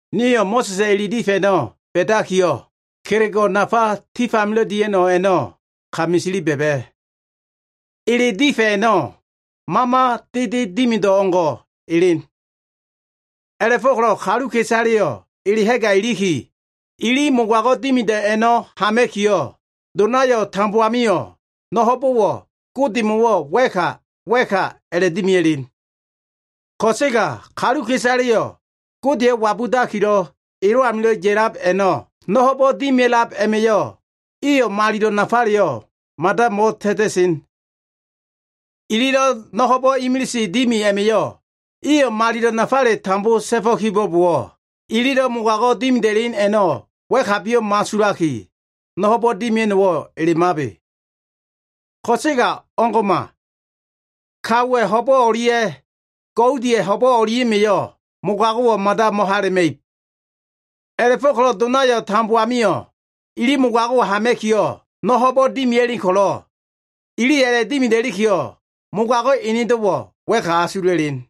Nio꞉ Mo꞉sa꞉sa꞉ ele difa꞉ a꞉no꞉ ba꞉dakiyo꞉, kelego꞉ nafa tif amilo꞉ dia꞉no꞉ a꞉no꞉ ka misili ba꞉ba꞉. Ele difa꞉ a꞉no꞉ mama dede dimido꞉ o꞉ngo꞉ elen. A꞉la꞉fo꞉ko꞉lo꞉ kaluka꞉isaleyo꞉ ele ha꞉ga iliki, ili mogago꞉ dimido꞉ a꞉no꞉ hama꞉kiyo꞉, donayo꞉ tambo amio꞉ no꞉ ho꞉bo꞉wo꞉ Godemo꞉wo꞉ wa꞉ka wa꞉ka a꞉la꞉dimia꞉len. Ko꞉sega kaluka꞉isaleyo꞉ Godeyo꞉ wabudakilo꞉ elo꞉ amilo꞉ ya꞉lab a꞉no꞉, no꞉ ho꞉bo꞉ dimia꞉lab a꞉ma꞉yo꞉ iyo꞉ malilo꞉ nafaleyo꞉ mada mo꞉ta꞉ta꞉sen. Ililo꞉ no꞉ ho꞉bo꞉ imilise dimi a꞉ma꞉yo꞉ iyo꞉ malilo꞉ nafale tambo ta꞉fo꞉ kibo꞉bowo꞉, ililo꞉ mogago꞉ dimida꞉len a꞉no꞉ wa꞉kabiyo꞉ mo꞉asulaki, no꞉ ho꞉bo꞉ dimia꞉no꞉wo꞉ elemabe. Ko꞉sega o꞉ngo꞉ma. Kaowa꞉ ho꞉bo꞉ o꞉lia꞉ goudiya꞉ ho꞉bo꞉ o꞉lia꞉ma꞉yo꞉ mogago꞉wo꞉ mada mo꞉hala꞉ma꞉ib. A꞉la꞉fo꞉ko꞉lo꞉ donayo꞉ tambo amio꞉ ili mogago꞉wo꞉ hama꞉kiyo꞉, no꞉ ho꞉bo꞉wo꞉ dimia꞉len ko꞉lo꞉, iliyo꞉ a꞉la꞉dimida꞉likiyo꞉ mogago꞉ enedo꞉wo꞉ wa꞉ka asula꞉len.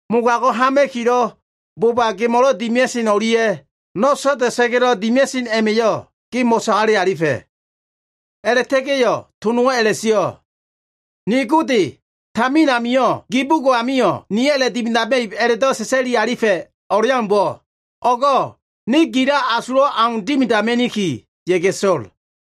Mogago꞉ hama꞉kilo꞉ boba gemo꞉lo꞉ dimia꞉sen o꞉lia꞉ no꞉ so꞉da꞉sa꞉ga꞉lo꞉ dimia꞉sen a꞉ma꞉yo꞉ ge mo꞉sagale alifa꞉.” A꞉la꞉ta꞉ga꞉yo꞉, to nowo꞉ a꞉la꞉sio꞉, “Ni Gode, tamina gi bugo꞉ amio꞉ niyo꞉ a꞉la꞉dimidama꞉ib a꞉la꞉do꞉ sa꞉sa꞉lifa꞉ o꞉leaumbo꞉, o꞉go꞉ ne gilo꞉ asulo꞉ au dimidama꞉ni, ya꞉ga꞉ so꞉l.”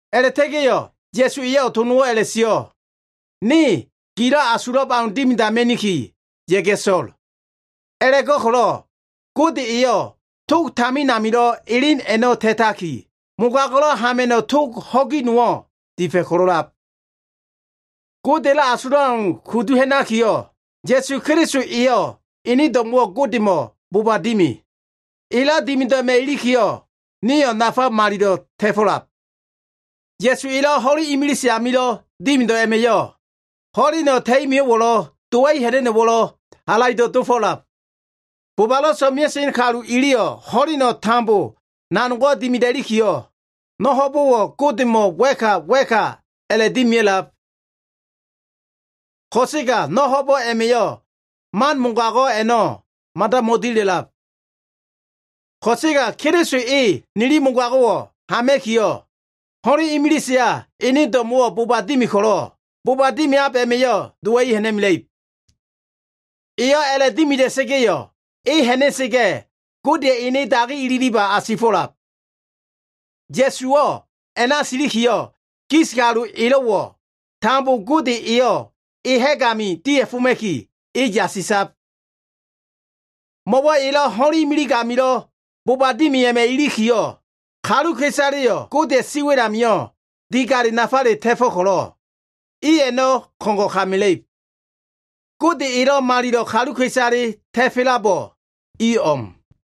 A꞉la꞉ta꞉ga꞉yo꞉, Ya꞉su eyo꞉ to nowo꞉ a꞉la꞉sio꞉, “Ne gilo꞉ asulab au dimidama꞉ni, ya꞉ga꞉ so꞉l.” A꞉la꞉go꞉ko꞉lo꞉ Gode eyo꞉ tog tamin amilo꞉ elen a꞉no꞉ ta꞉taki, mogago꞉lo꞉ hama꞉no꞉ tog ho꞉gi nowo꞉ difa꞉ ko꞉lo꞉lab. Godeya꞉lo꞉ asulab au kudu ha꞉nakiyo꞉, Ya꞉su Keliso eyo꞉ ene do꞉mo꞉wo꞉ Godemo꞉ boba dimi. Elo꞉ dimido꞉ a꞉ma꞉ ilikiyo꞉, nio꞉ nafa malilo꞉ ta꞉fo꞉lab. Ya꞉su elo꞉ ho꞉len imilise amilo꞉ dimido꞉ a꞉ma꞉yo꞉, ho꞉leno꞉ ta꞉i mio꞉wo꞉lo꞉, dowa꞉i ha꞉na꞉no꞉wo꞉lo꞉ halaido꞉ dofo꞉lab. Bobalo꞉ so꞉mea꞉sen kalu iliyo꞉ ho꞉leno꞉ tambo nanogo꞉ dimida꞉likiyo꞉, no꞉ ho꞉bo꞉wo꞉ Godemo꞉ wa꞉ka wa꞉ka a꞉la꞉dimia꞉lab. Ko꞉sega no꞉ ho꞉bo꞉ a꞉ma꞉yo꞉ man mogago꞉ a꞉no꞉ mada mo꞉dila꞉lab. Ko꞉sega Keliso e nili mogago꞉wo꞉ hama꞉kiyo꞉, ho꞉len imiliseya ene do꞉mo꞉wo꞉ boba dimi ko꞉lo꞉, boba dimiab a꞉ma꞉yo꞉ dowa꞉i ha꞉na꞉mela꞉ib. Eyo꞉ a꞉la꞉dimida꞉sa꞉ga꞉yo꞉, e ha꞉na꞉sa꞉ga꞉ Godeya꞉ ene dagi ililiba asifo꞉lab. Ya꞉suwo꞉ a꞉na silikiyo꞉, gis kalu elo꞉wo꞉ tambo Gode eyo꞉ e ha꞉g ami dia꞉foma꞉ki, e yasisab. Mo꞉wo꞉ elo꞉ ho꞉len imilig amilo꞉ boba dimi a꞉ma꞉ ilikiyo꞉, kaluka꞉isaleyo꞉ Godeya꞉ siwa꞉l amio꞉ digalo꞉ nafale ta꞉fo꞉ ko꞉lo꞉, i a꞉no꞉ ko꞉ngo꞉ ka mela꞉ib. Gode elo꞉ malilo꞉ kaluka꞉isale ta꞉fo꞉labo꞉ i o꞉m.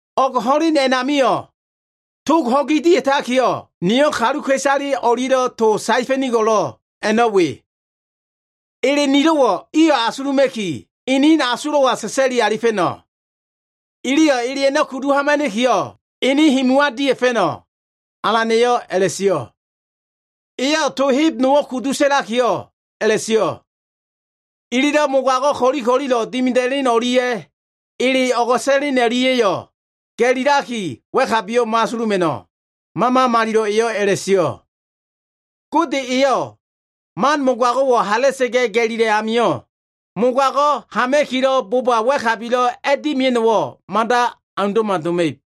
“O꞉g ho꞉len a꞉namio꞉, tog ho꞉gi dia꞉takiyo꞉, niyo꞉ kaluka꞉isale o꞉lia꞉lo꞉ to saefa꞉nigo꞉l a꞉no꞉ we. Ele nilo꞉wo꞉ iyo꞉ asuluma꞉ki, inin asulo꞉wa sa꞉sa꞉li alifa꞉no꞉. Iliyo꞉ ele a꞉no꞉ kudu hamana꞉kiyo꞉, inin himuwa dia꞉fa꞉no꞉.” Alan eyo꞉ a꞉la꞉sio꞉. Eyo꞉ to heb nowo꞉ kudu sa꞉lakiyo꞉ a꞉la꞉sio꞉, “Ililo꞉ mogago꞉ ko꞉li ko꞉lilo꞉ dimida꞉len o꞉lia꞉ ele o꞉go꞉sa꞉len o꞉lia꞉yo꞉ ga꞉lilaki wa꞉kabiyo꞉ mo꞉asuluma꞉no꞉.” Mama Malilo꞉ eyo꞉ a꞉la꞉sio꞉. Gode eyo꞉ man mogago꞉wo꞉ hala꞉sa꞉ga꞉ ga꞉lila꞉ amio꞉, mogago꞉ hama꞉kilo꞉ boba wa꞉kabilo꞉ a꞉dimia꞉no꞉wo꞉ mada aundo꞉ma doma꞉ib.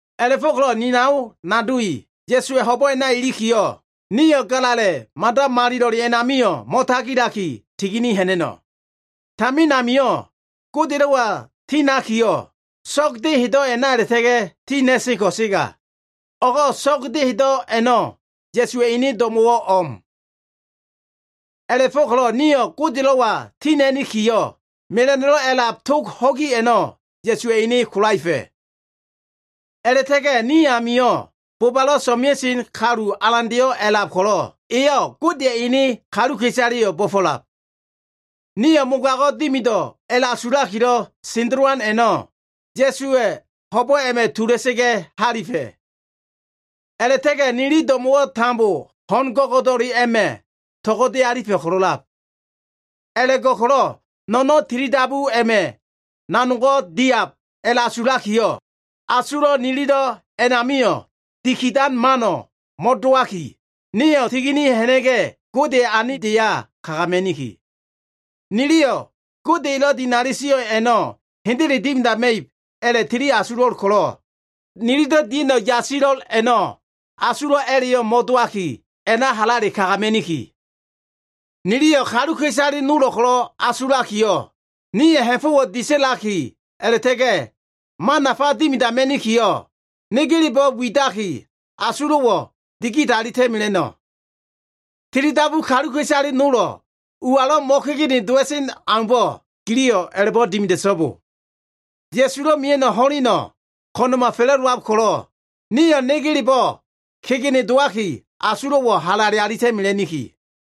A꞉la꞉fo꞉ko꞉lo꞉ ni nao nado i, Ya꞉suwa꞉ ho꞉bo꞉ a꞉na ilikiyo꞉, nio꞉ Galala꞉ Mada Malilo꞉le a꞉namio꞉ mo꞉tagilaki tigini ha꞉na꞉no꞉. Tamin amio꞉ Godelo꞉wa tinakiyo꞉, so꞉g dehedo꞉ a꞉na a꞉la꞉ta꞉ga꞉ tina꞉sen ko꞉sega, o꞉go꞉ so꞉g dehedo꞉ a꞉no꞉ Ya꞉suwa꞉ ene do꞉mo꞉wo꞉ o꞉m. A꞉la꞉fo꞉ko꞉lo꞉ nio꞉ Godelo꞉wa tina꞉nikiyo꞉, mela꞉no꞉lo꞉ a꞉lab tog ho꞉gi a꞉no꞉ Ya꞉suwa꞉ ene kolaefa꞉. A꞉la꞉ta꞉ga꞉ ni amio꞉ bobalo꞉ so꞉mea꞉sen kalu alandeyo꞉ a꞉lab ko꞉lo꞉, eyo꞉ Godeya꞉ ene kaluka꞉isaleyo꞉ bo꞉fo꞉lab. Nio꞉ mogago꞉ dimido꞉ a꞉la꞉asulakilo꞉ sendelowan a꞉no꞉ Ya꞉suwa꞉ ho꞉bo꞉ a꞉ma꞉ tula꞉sa꞉ga꞉ halifa꞉. A꞉la꞉ta꞉ga꞉ nili do꞉mo꞉wo꞉ tambo ho꞉n go꞉go꞉do꞉le a꞉ma꞉ to꞉go꞉de alifa꞉ ko꞉lo꞉lab. A꞉la꞉go꞉ko꞉lo꞉ no꞉no꞉n tilidabu a꞉ma꞉yo꞉ nanogo꞉ diab a꞉la꞉asulakiyo꞉, asulo꞉ nililo꞉ a꞉namio꞉ dikidan mano꞉ mo꞉dowaki, nio꞉ tigini ha꞉na꞉ga꞉, Godeya꞉ anibdeya kagama꞉niki. Niliyo꞉ Gode elo꞉ dinali sio꞉ a꞉no꞉ hendele dimidama꞉ib a꞉la꞉tili asulo꞉l ko꞉lo꞉, nililo꞉ dia꞉no꞉ yasilo꞉l a꞉no꞉, asulo꞉ a꞉la꞉yo꞉ mo꞉dowaki, a꞉na halale kagama꞉niki. Niliyo꞉ kaluka꞉isale nolo꞉ ko꞉lo꞉ asulakiyo꞉, nio꞉ ha꞉fo꞉wo꞉ disa꞉laki a꞉la꞉ta꞉ga꞉ man nafa dimidama꞉nikiyo꞉, negelebo꞉ widaki asulo꞉wo꞉ digidalita꞉ mela꞉no꞉. Tilidabu kaluka꞉isale nolo꞉ ualo꞉ mo꞉kegene dowa꞉sen aumbo꞉, giliyo꞉ a꞉la꞉bo꞉ dimida꞉so꞉bo. Ya꞉sulo꞉ mia꞉no꞉ ho꞉leno꞉ ko꞉na꞉ma fa꞉la꞉dowab ko꞉lo꞉, nio꞉ negelebo꞉ kegene dowaki, asulo꞉wo꞉ halale alita꞉mela꞉niki.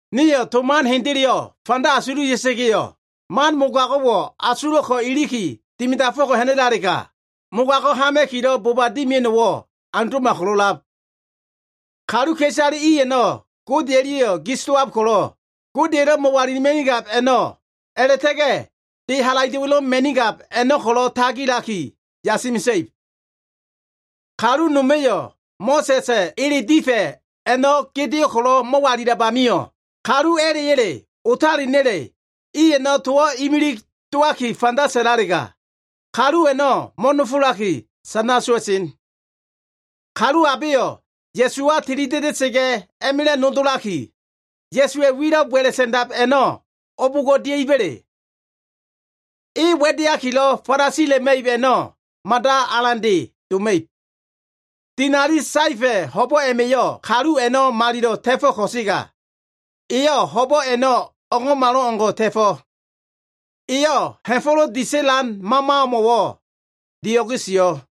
Nio꞉ to man hendeleyo꞉ fanda asululia꞉sa꞉ga꞉yo꞉, man mogago꞉wo꞉ asulo꞉ ko꞉ iliki dimidafo꞉ko꞉ ha꞉na꞉lalega, mogago꞉ hama꞉kilo꞉ boba dimia꞉no꞉wo꞉ aundo꞉ma ko꞉lo꞉lab. Kaluka꞉isale i a꞉no꞉ Gode o꞉lia꞉yo꞉ gis dowab ko꞉lo꞉, Godeya꞉lo꞉ mo꞉walilima꞉nigab a꞉no꞉ a꞉la꞉ta꞉ga꞉ de halaido꞉wa꞉lo꞉ ma꞉nigab a꞉no꞉ ko꞉lo꞉ tagilaki yasi mesa꞉ib. Kalu noma꞉yo꞉ Mo꞉sa꞉sa꞉ ele difa꞉ a꞉no꞉ gedeo꞉ ko꞉lo꞉ mo꞉walilab amio꞉, kalu a꞉la꞉ya꞉le otalena꞉le iyo꞉ towo꞉ imilig dowaki fanda sa꞉lalega, kalu a꞉no꞉ mo꞉nofolaki sana sowa꞉sen. Kalu abeyo꞉ Ya꞉suwa tilida꞉da꞉sa꞉ga꞉ a꞉ma꞉la꞉ nodolaki, Ya꞉suwa꞉ wilo꞉ wa꞉la꞉ sa꞉ndab a꞉no꞉ o꞉bo꞉ngo꞉ dia꞉iba꞉le? E wa꞉deakilo꞉ falasila꞉ma꞉ib a꞉no꞉ mada alande doma꞉ib. Dinali saefa꞉ ho꞉bo꞉ a꞉ma꞉yo꞉ kalu a꞉no꞉ malilo꞉ ta꞉fo꞉ ko꞉sega, eyo꞉ ho꞉bo꞉ a꞉no꞉ o꞉ngo꞉malo꞉ngo꞉ ta꞉fo꞉. Eyo꞉ ha꞉fo꞉lo꞉ disa꞉lan Mamamo꞉wo꞉ dio꞉ge sio꞉.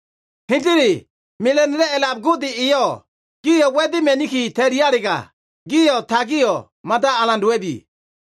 Hendele, mela꞉no꞉lo꞉ a꞉lab Gode eyo꞉ gio꞉ wa꞉dema꞉niki ta꞉lialega, gio꞉ tagio꞉ mada alan dowa꞉bi.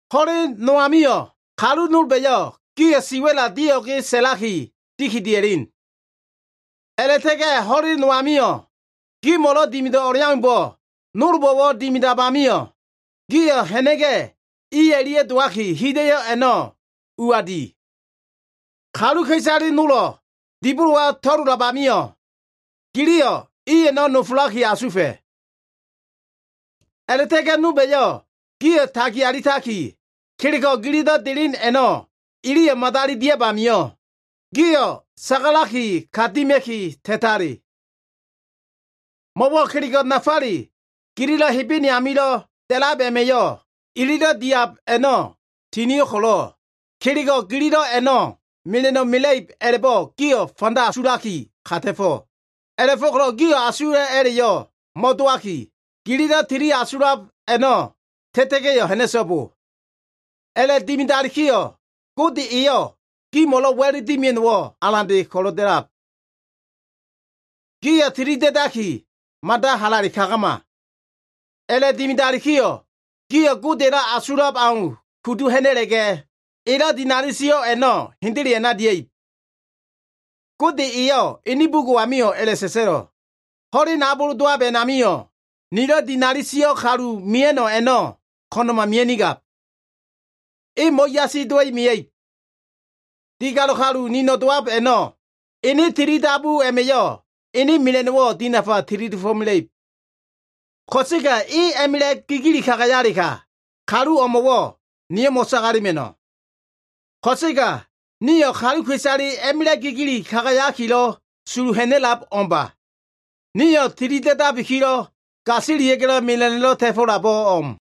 Ho꞉len nol amio꞉, kalu nolba꞉yo꞉ gio꞉ siwa꞉la dio꞉ge sa꞉laki dikidia꞉len. A꞉la꞉ta꞉ga꞉ ho꞉len nol amio꞉, gimo꞉lo꞉ dimido꞉ o꞉leaumbo꞉ nolbo꞉wo꞉lo꞉ dimiab amio꞉, gio꞉ ha꞉na꞉ga꞉ i o꞉lia꞉ dowaki, hida꞉yo꞉ a꞉no꞉ ua di. Kaluka꞉isale nolo꞉ dibolowa to꞉lolab amio꞉, giliyo꞉ i a꞉no꞉ nofolaki asufa꞉. A꞉la꞉ta꞉ga꞉ nolba꞉yo꞉ gio꞉ tagi alitaki, kelego꞉ gililo꞉ delen a꞉no꞉ iliyo꞉ madali diab amio꞉, gio꞉ sagalaki ka dima꞉ki ta꞉tale. Mo꞉wo꞉ kelego꞉ nafale gililo꞉ Hebene amilo꞉ da꞉lab a꞉ma꞉yo꞉ ililo꞉ diab a꞉no꞉ tinio꞉ ko꞉lo꞉, kelego꞉ gililo꞉ a꞉no꞉ mela꞉no꞉ mela꞉ib a꞉la꞉bo꞉ gio꞉ fanda asulaki, ka ta꞉fo꞉. A꞉la꞉fo꞉ko꞉lo꞉ gio꞉ asulo꞉ a꞉la꞉yo꞉ mo꞉dowaki, gililo꞉ tili asulab a꞉no꞉ ta꞉ta꞉ga꞉yo꞉ ha꞉na꞉so꞉bo. A꞉la꞉dimidalikiyo꞉ Gode eyo꞉ gimo꞉lo꞉ wa꞉l dimia꞉no꞉wo꞉ alan ko꞉lo꞉ da꞉lab. Gio꞉ tilida꞉daki, mada halale kagama. A꞉la꞉dimidalikiyo꞉, gio꞉ Godeya꞉lo꞉ asulab au kudu ha꞉na꞉la꞉ga꞉, elo꞉ dinali sio꞉ a꞉no꞉ hendele a꞉na dia꞉ib. Gode eyo꞉ ene bugo꞉ amio꞉ a꞉la꞉sa꞉sa꞉lo꞉, “Ho꞉len abol dowab a꞉namio꞉, nilo꞉ dinali sio꞉ kalu mia꞉no꞉ a꞉no꞉ ko꞉na꞉ma mia꞉nigab. E mo꞉yasi dowa꞉i mia꞉ib.” “Digalo꞉ kalu nino꞉ dowab a꞉no꞉ ene tilidabu a꞉ma꞉yo꞉ ene mela꞉no꞉wo꞉ dinafa tili dofo꞉mela꞉ib. Ko꞉sega e a꞉ma꞉la꞉ gigili kagayalega, kalu o꞉mo꞉wo꞉ niyo꞉ mo꞉sagalema꞉no꞉.” Ko꞉sega nio꞉ kaluka꞉isale a꞉ma꞉la꞉ gigili kagayakilo꞉ sulu ha꞉na꞉lab o꞉mba. Nio꞉ tilida꞉dabikilo꞉, gasilia꞉ga꞉lo꞉ mela꞉no꞉lo꞉ ta꞉fo꞉labo꞉ o꞉m.